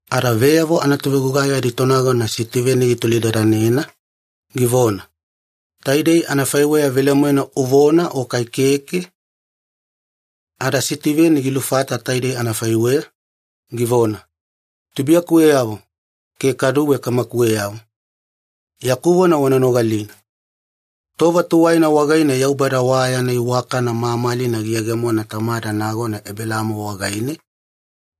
Ada veyavo anatovegugai aditonagona Sitiveni gitolidadanena, givona, “Taidei anafaiweya velemoena uvona o kai keke?” Ada Sitiveni gilufata taidei anafaiweya, givona, “Tubuiyakuweyavo ke kaduwe kamakuweyavo, yaku vona wana nogalina. Tova tuwaina wagaine Yaubada wa yana iwakana mamalina giyegemona tamada nagona Ebelaamo wagaine,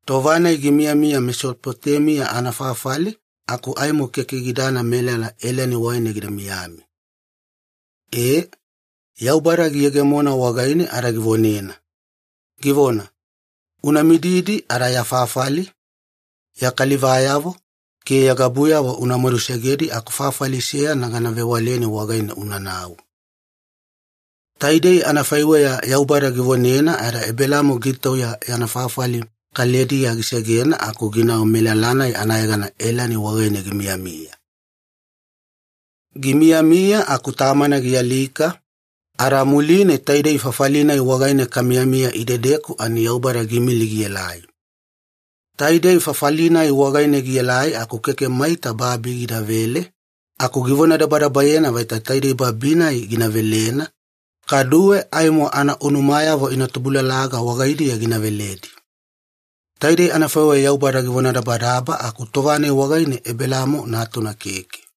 tova-nai gimiyamiya Mesopotemiya anafafali aku aimo keke gidana melala Elani wagaine gida miyami. Ee, Yaubada giyegemona wagaine ada givonena, givona, ‘Una mididi ada ya fafali, ya kalivayavo ke ya gabuyavo una madusegedi aku fafali seyana gana vewaleni wagaine unanau.’ Taidei anafaiweya Yaubada givonena ada Ebelaamo gitauya yana fafali Kalidiya gisegena aku ginau melala-nai anayegana Elani wagaine gimiyamiya. “Gimiyamiya aku tamana gialika, ada muline taidei fafali-nai wagaine kamiyamiya idedeku ani Yaubada giimili gielai. Taidei fafali-nai wagaine gielai aku keke maita babi gidavele, aku givonadabadabayena vaita taidei babi-nai gina velena, kaduwe aimo anaunumayavo ina tubulalaga wagaidiya gina veledi. Taidei anafaiweya Yaubada givonadabadaba aku tova-nai wagaine Ebelaamo natuna keke.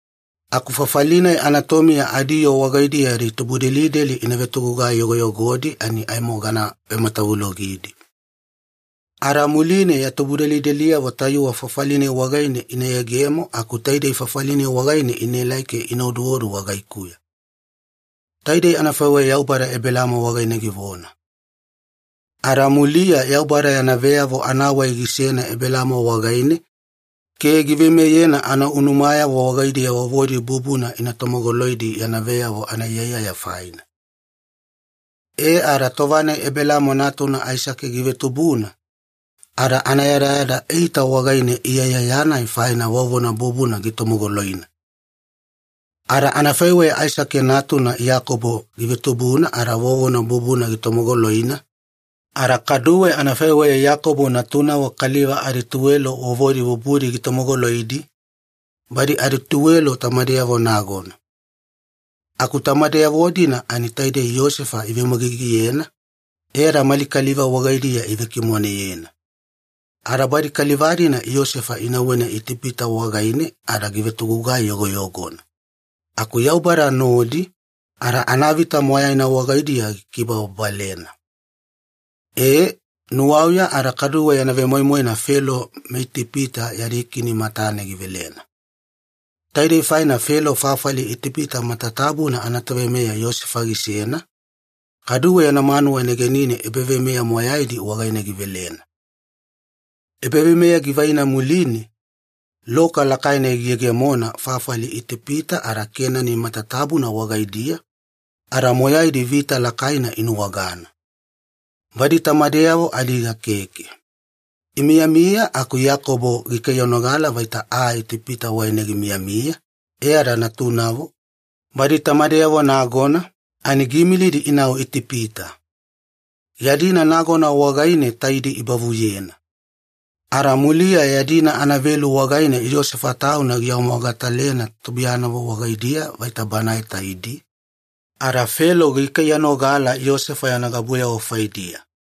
Aku fafali-nai anatomiya adiyoo wagaidiya ya tubudelideli ina vetogugai yogoyogodi ani aimo gana vematavulogidi. Ada muline ya tubudelideliyavo tayuwe fafali-nai wagaine ina yegemo aku taidei fafali-nai wagaine inaelai ke ina oduodu wagaikuya.’ Taidei anafaiweya Yaubada Ebelaamo wagaine givona. Ada muliya Yaubada yana veyavo anawai gisena Ebelaamo wagaine ke giveimeyena anaunumayavo wagaidiya vovodi bubuna ina tomogoloidi yana veyavo anaiyaiyaya faina. E ada tova-nai Ebelaamo natuna Aisake givetubuna, ada anayadayada eita wagaine iyaiyaya-nai faina vovona bubuna gitomogoloina. Ada anafaiweya Aisake natuna Iyakobo givetubuna ada vovona bubuna gitomogoloina, ada kaduwe anafaiweya Iyakobo natunavo kaliva adituwelo vovodi bubudi gitomogoloidi, badi adituwelo tamadeyavo nagona. “Aku tamadeyavo-dina ani taidi Iyosefa iveumagigiyena, e ada mali kaliva wagaidiya ivekimoneyena. Ada badi kaliva-dina Iyosefa inauwena Itipita wagaine ada givetogugai yogoyogona. Aku Yaubada nodi, ada anavita moyaina wagaidiya gikibababalena. Ee, nuwauya ada kaduwe yana vemoimoina Felo meItipita yadi kini matane givelena. Taidei faina Felo fafali Itipita matatabuna anatoveimeya Iyosefa gisena, kaduwe yana manuwa negenine ebaveimeya moyaidi wagaine givelena. “Ebaveimeya givaina muline, loka lakaina giyegemona fafali Itipita ada Kenani matatabuna wagaidiya, ada moyaidi vita lakaina inuwagana. Badi tamadeyavo adiga keke. Imiyamiya aku Iyakobo gikaiyanogala vaita aa Itipita wagaine gimiyamiya, e ada natunavo, badi tamadeyavo nagona, ani giimilidi inau Itipita. Yadina nagona wagaine taidi ibavuyena. Ada muliya yadina anavelu wagaine Iyosefa tauna giawamogatalena tubuiyanavo wagaidiya vaita banae taidi, ada Felo gikaiyanogala Iyosefa yana gabuyavo faidiya.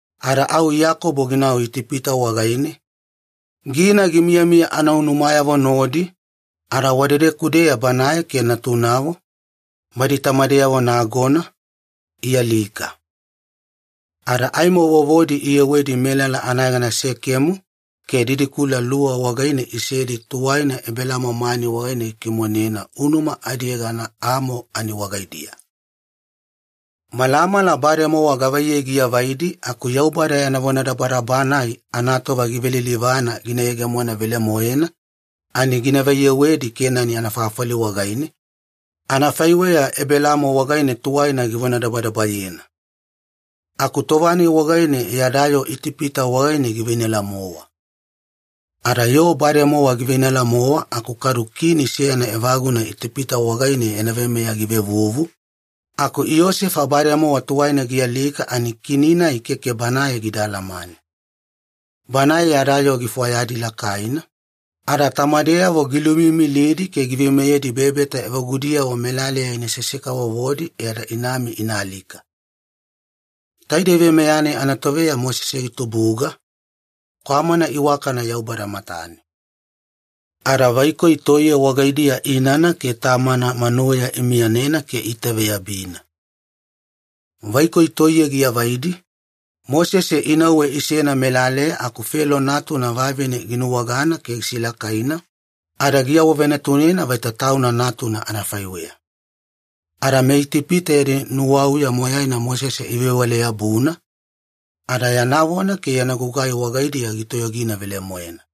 Ada au Iyakobo ginau Itipita wagaine, gina gimiyamiya anaunumayavo nodi, ada wadedeku-deya banae ke natunavo, badi tamadeyavo nagona, ialika. Ada aimo vovodi iyewedi melala anayegana Sekemu ke didikula luwa wagaine isedi tuwaina Ebelaamo mani wagaine gikimonena unuma adiyegana Amo ani wagaidiya. “Malamala bademowa gavaiyei giavaidi aku Yaubada yana vonadabadaba-nai anatova givelilivana gina yegemona velemoena ani gina vaiyewedi Kenani anafafali wagaine, anafaiweya Ebelaamo wagaine tuwaina givonadabadabayena. Aku tova-nai wagaine yada yoo Itipita wagaine giveinala-mowa. Ada yoo bademowa giveinala-mowa aku kadu kini seyana evaguna Itipita wagaine yana veimeya givevuvu, aku Iyosefa bademowa tuwaina gialika ani kini-nai keke banae gida alamane. Banae yada yoo gifwayadi lakaina, ada tamadeyavo giluimiimilidi ke giveimeyedi bebeta evagudiyavo melaleya inasese-kavovodi e ada inami ina alika. “Taidei veimeya-nai anatoveya Mosese gitubuga, kwamana iwakana Yaubada matane. Ada vaikoi toiye wagaidiya inana ke tamana manuweya imiyanena ke iitaveyabina. Vaikoi toiye giavaidi, Mosese inauwe isena melaleya aku Felo natuna vavine ginuwagana ke gisilakaina, ada giawavenatunena vaita tauna natuna anafaiweya. Ada meItipita yadi nuwauya moyaina Mosese ivewale-yabuna, ada yana vona ke yana gugai wagaidiya gitoyogina velemoena.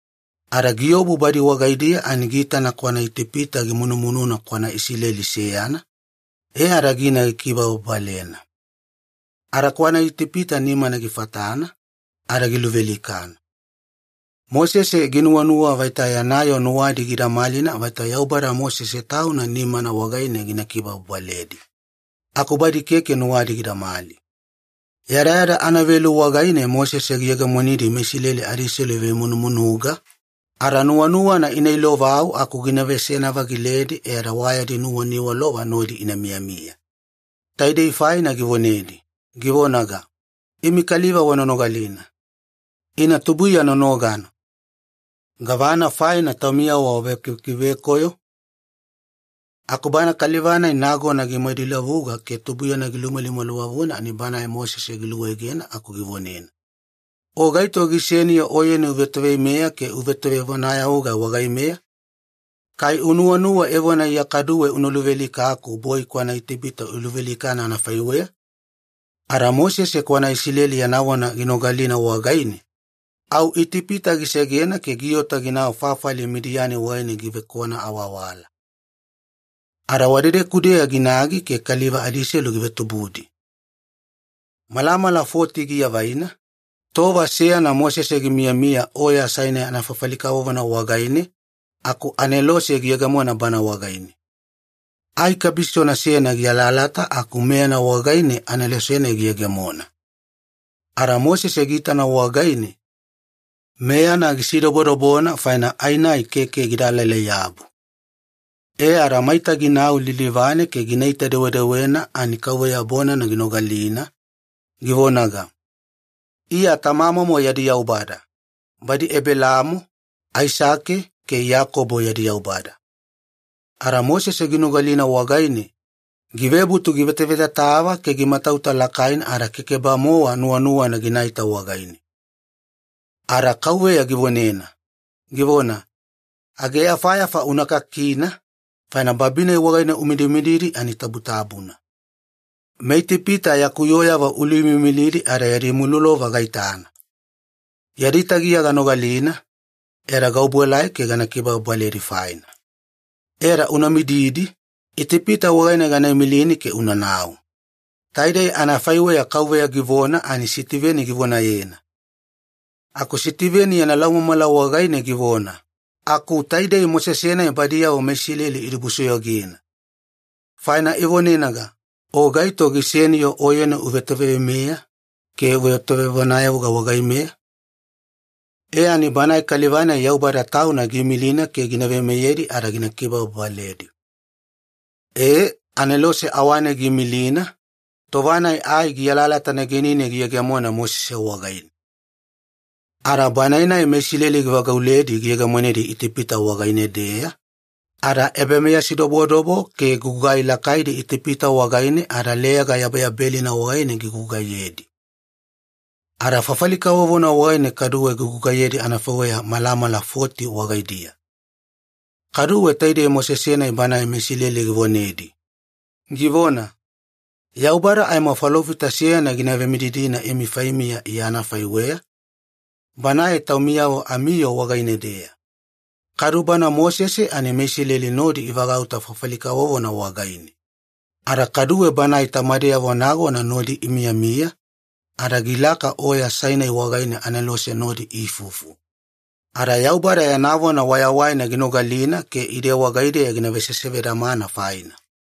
Ada giobu badi wagaidiya ani giitana kwana Itipita gimunumununa kwana Isileli seyana, e ada gina gikibababalena. Ada kwana Itipita nimana gifatana, ada giluvealikana. Mosese ginuwanuwa vaita yana yoo nuwadi gida malina vaita Yaubada Mosese tauna nimana wagaine gina kibababaledi. Aku badi keke nuwadi gidamali. Yadayada anavelu wagaine Mosese giyegemonidi meIsileli adiselu ivemunumunuga, ada nuwanuwana ina ilovau aku gina veseyana-vagiledi e ada wa yadi nuwaniwalova nodi ina miyamiya. Taidei faina givonedi, givonaga, ‘Imi kaliva wana nogalina. Ina tubuiya nonogana. Gavana faina taumiyavo wavekivekivekoyo?’ “Aku bana kaliva-nai nagona gimaduilavuga ke tubuiyana gilumalimaliwavuna ani banae Mosese giluegena aku givonena, ‘O gaito giseni-yo oyeni uvetoveimeya ke uvetovevonayavuga wagaimeya? Kai unuwanuwa evona Iya kaduwe una luvealikaku boi kwana Itipita uluvealikana anafaiweya?’ Ada Mosese kwana Isileli yana vona ginogalina wagaine, au Itipita gisegena ke giota ginau fafali Midiyani wagaine givekwana awawala. Ada wadedeku-deya ginagi ke kaliva adiselu givetubudi. “Malamala foti giavaina, tova seyana Mosese gimiyamiya Oya Sainai anafafali kavovona wagaine aku anelose giyegemona bana wagaine. Ai kabisona seyana gialalata aku meyana wagaine anelose-nai giyegemona. Ada Mosese giitana wagaine, meyana gisidobodobona faina ai-nai keke gida alalai-yabu. E ada maita ginau lilivane ke ginaita-dewedewena ani KAUVEYA bonana ginogalina, givonaga, ‘Iya tamamomo yadi Yaubada, badi Ebelaamo, Aisake, ke Iyakobo yadi Yaubada.’ Ada Mosese ginogalina wagaine, givebutu givetavetatava ke gimatauta lakaina ada keke-bamowa nuwanuwana ginaita wagaine. “Ada KAUVEYA givonena, givona, ‘Aageyafayafa una kakina, faina babi-nai wagaine umidimididi ani tabutabuna. MeItipita yaku yooyavo iluimiimilidi ada yadi mulolova gaitana. Yadi tagiya ganogalina, e ada gaobuelai ke gana kibababaledi faina. E ada una mididi, Itipita wagaine gana imilini ke unanau.’” Taidei anafaiweya KAUVEYA givona ani Sitiveni givonayena. Kaduwe Sitiveni yana laumamala wagaine givona, “Aku taidei Mosese-nai badiyavo meIsileli idibusoyogena. Faina ivonenaga, ‘O gaito giseni-yo oyeni uvetoveimeya ke uvetovevonayavuga wagaimeya?’ E ani banae kaliva-nai Yaubada Tauna giimilina ke gina veimeyedi ada gina kibababaledi. E, anelose awane giimilina, tova-nai ai gialalata negenine giyegemona Mosese wagaine. Ada banae-nai meIsileli givagauledi giyegemonedi Itipita wagaine-deya, ada ebameyasidobodobo ke gugai lakaidi Itipita wagaine ada Leyaga Yabeyabelina wagaine gigugaiyedi. Ada fafali kavovona wagaine kaduwe gigugaiyedi anafaiweya malamala foti wagaidiya. “Kaduwe taidei Mosese-nai banae meIsileli givonedi, givona, ‘Yaubada aimo Falofita seyana gina vemididina imi faimiya Iya anafaiweya, Banae taumiyavo amiyoo wagaine-deya.’ Kadu bana Mosese ani meIsileli nodi ivagauta fafali kavovona wagaine. Ada kaduwe banae tamadeyavo nagona nodi imiyamiya, ada gilaka Oya Sainai wagaine anelose nodi iifufu, ada Yaubada yana vona wayawaina ginogalina ke ide wagaideya gina vesesevedamana faina.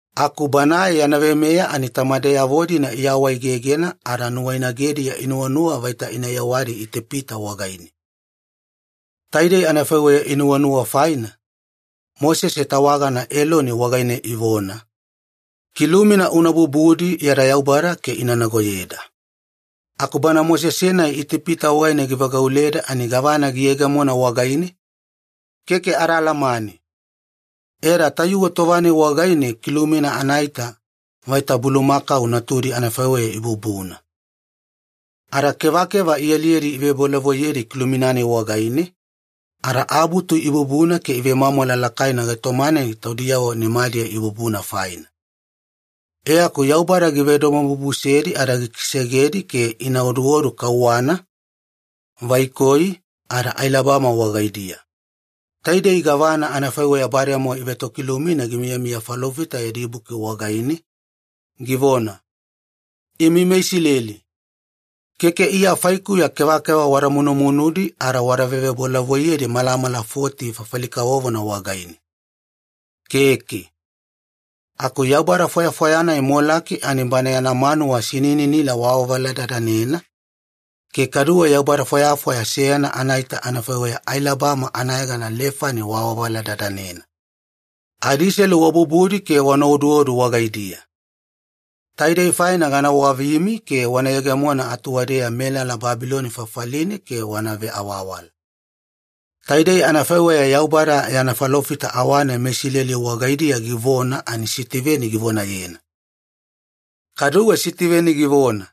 “Aku banae yana veimeya ani tamadeyavo-dina iawaegegena ada nuwainagediya inuwanuwa vaita ina yewadi Itipita wagaine. Taidei anafaiweya inuwanuwa faina, Mosese tawagana Eloni wagaine ivona, ‘Kilumina una bubudi yada yaubada ke ina nagoyeda. Aku bana Mosese-nai Itipita wagaine givagauleda ani gavana giyegemona wagaine? Keke ada alamane!’ E ada tayuwe tova-nai wagaine kilumina anaita vaita bulumakau natudi anafaiweya ibubuna. Ada kevakeva ialiyedi ivebolavoiyedi kilumina-nai wagaine, ada abutu ibubuna ke ivemwamwala lakaina gaitoma-nai taudiyavo nimadiya ibubuna faina. E aku Yaubada givedomobubusedi ada gikisegedi ke ina oduodu kauwana, vaikoi, ada ailabama wagaidiya. Taidei gavana anafaiweya bademowa ivetokilumina gimiyamiya falofita yadi buki wagaine, givona, ‘Imi meIsileli, keke Iya faikuya kevakeva wada munumunudi ada wada vevebolavoiyedi malamala foti fafali kavovona wagaine. Keke. Aku yaubada fwayafwaya-nai Molaki ani bana yana manuwa sinininila waavaladadanena, ke kaduwe yaubada fwayafwaya seyana anaita anafaiweya ailabama anayegana Lefani waavaladadanena. Adiselu wabubudi ke wana oduodu wagaidiya. Taidei faina gana wavimi ke wana yegemona atuwadeya melala Babiloni fafaline ke wana veawawala.’” Taidei anafaiweya Yaubada yana falofita awane meIsileli wagaidiya givona ani Sitiveni givonayena. Kaduwe Sitiveni givona,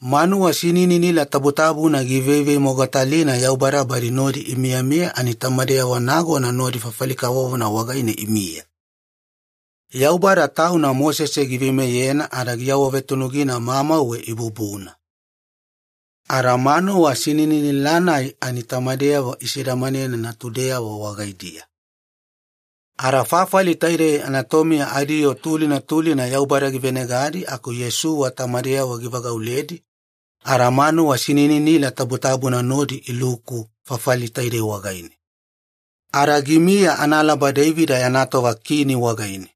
“Manuwa sinininila tabutabuna giiveivemogatalina Yaubada badi nodi imiyamiya ani tamadeyavo nagona nodi fafali kavovona wagaine imiya. Yaubada Tauna Mosese giveimeyena ada giawavetunugina mamauwe ibubuna. Ada manuwa sinininila-nai ani tamadeyavo isedamanena natudiyavo wagaidiya. Ada fafali taidei anatomiya adiyoo tulina tulina Yaubada givenegadi aku Iyosuwa tamadeyavo givagauledi ada manuwa sinininila tabutabuna nodi iluku fafali taidei wagaine. Ada gimiya analaba Deivida yana tova kini wagaine.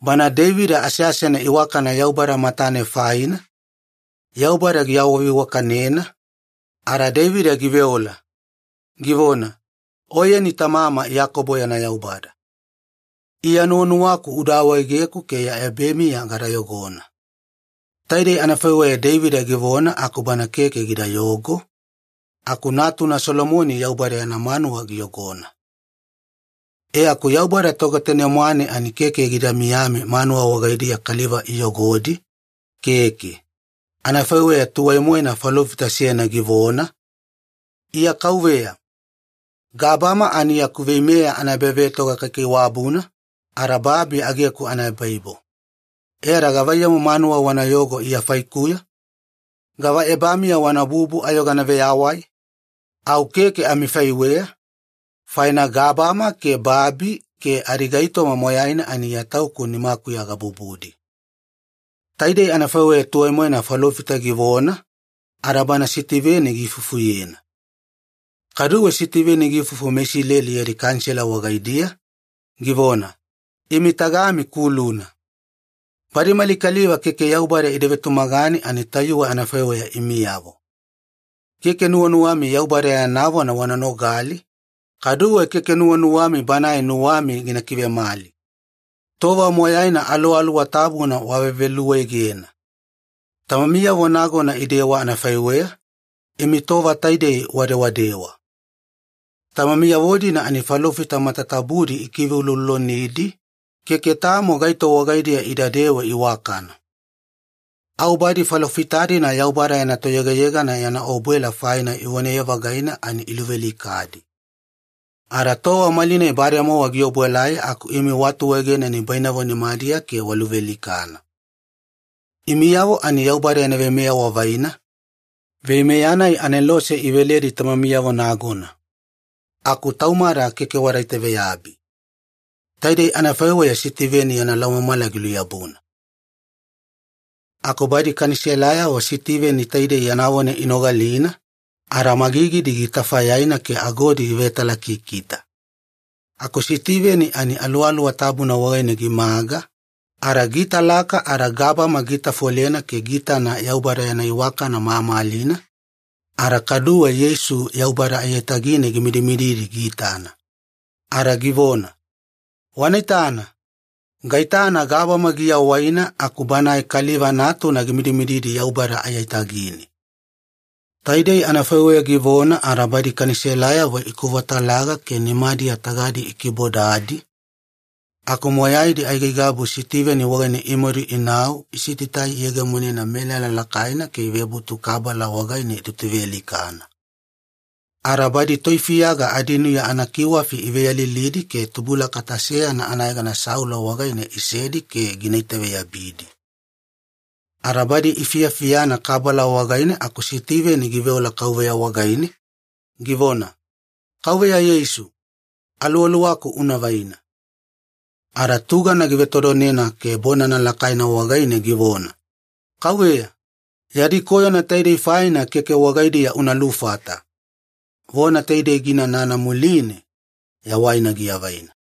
Bana Deivida aseasena iwakana Yaubada matane faina, Yaubada giawaveiwakanena, ada Deivida giveola, givona, ‘Oyeni tamama Iyakobo yana Yaubada. Iya nuwanuwaku uda awaegeku ke ya ebamiya gada yogona.’ Taidei anafaiweya Deivida givona aku bana keke gidayogo, aku natuna Solomoni Yaubada yana manuwa giyogona. “E aku Yaubada Togetanemwane ani keke gida miyami manuwa wagaidiya kaliva iyogodi, keke. Anafaiweya tuwai-moena falofita seyana givona, ‘Iya KAUVEYA. Gabama ani yaku veimeya anaebavetoga kaikaiwabuna, ada babi ageku anaebaibo. E ada gavaiyamu manuwa wana yogona Iya faikuya? Gava ebamiya wana bubu ayo gana veyawai? Au keke amifaiweya, faina gabama ke babi ke adigaitoma moyaina ani Iya Tauku nimakuya gabubudi.’” Taidei anafaiweya tuwai-moena falofita givona, ada bana Sitiveni giifufuyena. Kaduwe Sitiveni giifufu meIsileli yadi Kanisela wagaidiya, givona, “Imi tagami kuluna. Badi mali kaliva keke Yaubada ida vetumagane ani tayuwe anafaiweya imiyavo. Keke nuwanuwami Yaubada yana vona wana nogali, kaduwe keke nuwanuwami Banae nuwami gina kivemali. Tova moyaina Aluwaluwa Tabuna waveveluegena. Tamamiyavo nagona idewa anafaiweya, imi tova taidei wadewadewa. Tamamiyavo-dina ani falofita matatabudi ikiveuloulolonidi, keke tamo gaito wagaidiya idadewe iwakana. Au badi falofita-dina Yaubada yana Toyegayegana yana obuela faina ivonaye-vagaina ani iluvealikadi. Ada tova malinai bademowa giobuelai aku imi waatuegena nibainavo nimadiya ke waluvealikana. Imiyavo ani Yaubada yana veimeya wavaina, veimeya-nai anelose iveledi tamamiyavo nagona. Aku taumada, keke wada itaveyabi.” Taidei anafaiweya Sitiveni yana laumamala giluyabuna. Aku badi Kaniselayavo Sitiveni taidei yana vona inogalina, ada magigidi gitafayaina ke agodi givetalakikita. Aku Sitiveni ani Aluwaluwa Tabuna wagaine gimaga, ada giitalaka ada gabama giitafolena ke giitana Yaubada yana iwakana mamalina, ada kaduwe Yeisu Yaubada aiyatagine gimidimididi giitana. Ada givona, “Wana itana! Gaitana gabama giawaina aku Banae Kaliva Natuna gimidimididi Yaubada aiyatagine!” Taidei anafaiweya givona ada badi Kaniselayavo ikovatalaga ke nimadiya tagadi ikibodadi, aku moyaidi aigaigabu Sitiveni wagaine imadu inau isitaitai iyegemonena melala lakaina ke ivebutu kabala wagaine itutuvealikana. Ada badi toifiyaga adinuya anakiwafi iveyalilidi ke tubulakata seyana anayegana Saulo wagaine isedi ke gina itaveyabidi. Ada badi ifiyafiyana kabala wagaine aku Sitiveni giveola Kauveya wagaine, givona, “Kauveya Yeisu, aluwaluwaku una vaina.” Ada tugana givetodonena ke bonana lakaina wagaine givona, “Kauveya, yadi koyona taidei faina keke wagaidiya una lufata.” Vona taidei giinanana muline, yawaina giavaina.